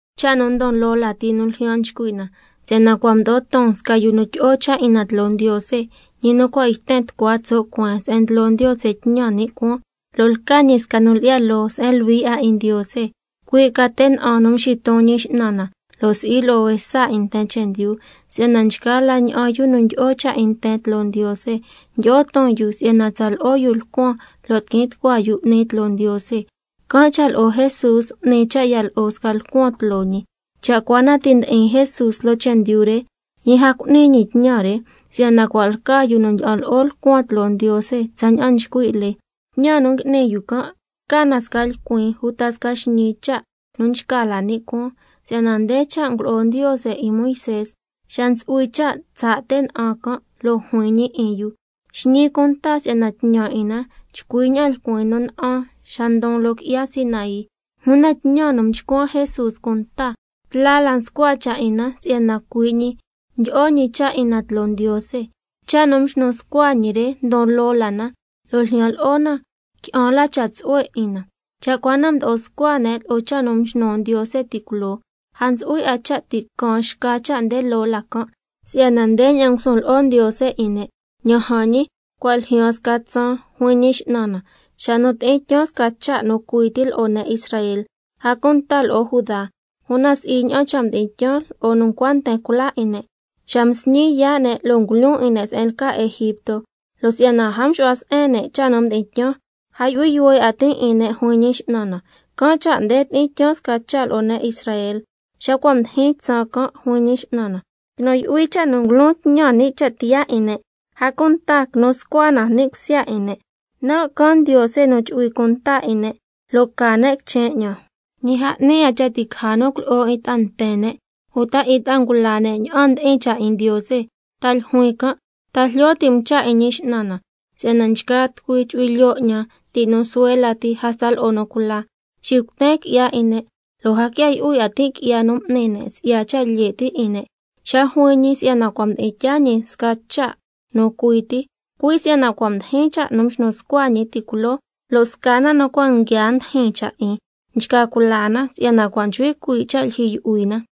Cha' nu ndon loo lati nu ljyan nchcui' na, si'yana cua' mdo'o ton sca nu tyi'o cha' 'in na tloo Ndiose, ñi nu cua' yten tucua tso' cueen se'en ndlo Ndiose tñan ni' cuaan, lo' lca ñi sca nu lyi'ya loo se'en luhui 'a 'in Ndiose, ycui' ca te' na'an nu mxiton Ñi X'nan na, lo' si'i lo'o juesa 'in nten chendyu. Si'yana nchgaa la ña'an yu nu ndyi'o cha' 'in nten tloo Ndiose, ndyi'o ton yu si'yana tsa lo'o yu lcuan lo' tiquin tucua yu 'ni tloo Ndiose, can' cha' lo'o Jesús m'ni cha' ya lo'o sca lcuan tloo ñi. Cha' cua na ti' ndi'in Jesús loo chendyu re, ñi a cu'ni ñi tñan re, si'yana cua' lca yu nu ndyi'an lo'o lcuan tloo Ndiose tsaña'an nchcui' lee. Tñan nu ngui'ni yu can' lca na sca lcuin uta sca xñii cha' nu nchca la ni' cuaan, si'yana nde cha' ngulo'o Ndiose 'in Moisé xa ntsu'hui cha' tsaa' te' na'an can', lo' juin ñi 'in yu: —Xñi cunta si'yana tñan 'in na chcui na'an lcuin nu na'an xa ndon loo qui'ya Sinaí—. Una tñan nu mchcuan Jesús cunta, tla la nscua cha' 'in na si'yana cui' ñi ndo'o ñi cha' 'in na tloo Ndiose. Cha' nu mxnu scua ñi re ndon loo la na, lo' ljyan lo'o na qui'an la cha' tsu'hue 'in na. Cha' cua na mdo'o scua ne' lo'o cha' nu mxnu Ndiose ti' culoo, a ntsu'hui 'a cha' ti' caan xca cha' nde loo la can'. Si'yana ndeña'an ngusun lo'o Ndiose 'in ne': —Ña'an jan ñi, cua' ljyaan sca tsaan, juin Ñi X'nan na, xa nu tyi'in tyaan sca cha' nu cui ti lo'o ne' Israel, a cunta lo'o Judá. Una si'i ña'an cha' mdi'in tyaan lo'o nu ncua nten cula 'in ne', xa msñin yaa' ne' lo' ngulyoon 'in ne' se'en lca Egipto. Lo' si'yana a mxu'hua se'en ne' cha' nu mdi'in tyaan, can' cha' a yu'hui yuhue 'a tin' 'in ne', juin Ñi X'nan na. Can' cha' nde tyi'in tyaan sca cha' lo'o ne' Israel, xa cua' mdijin tsaan can', juin Ñi X'nan na. Quinu yu'hui cha' nu ngulon tñan ni' cha' tiyaa 'in ne', a cunta quinu scua na ni' cusya 'in ne'. Nan' can Ndiose nu chu'hui cunta 'in ne', lo' ca ne' quichen 'ñan. Ñi a 'ni 'a cha' ti' caja nu culo'o 'in ta'a nten ne' uta 'in ta'a ngula ne' ña'an ndi'in cha' 'in Ndiose, ta ljuin can': ¿Ta jlyo ti' um cha' 'in Ñi X'nan na? Si'yana nchgaa tucui chu'hui lyoo 'ñan, ti' nu suhue lati hasta lo'o nu cula. Xicuten qui'ya 'in ne', lo' a quia yu'hui 'a tin' qui'ya m'ni ne' lo'o cha' lye' ti' 'in ne'—. Xa juin ñi si'yana cua' mdi'in tyaa ñi sca cha' nu cui ti, cui' si'yana cua' mdijin cha' nu mxnu scua ñi ti' culoo, lo' sca na nu cua' nguiaa ndijin cha' 'in, nchca cula na si'yana cua' nchcui cuii' cha' lyijyi yu'hui na.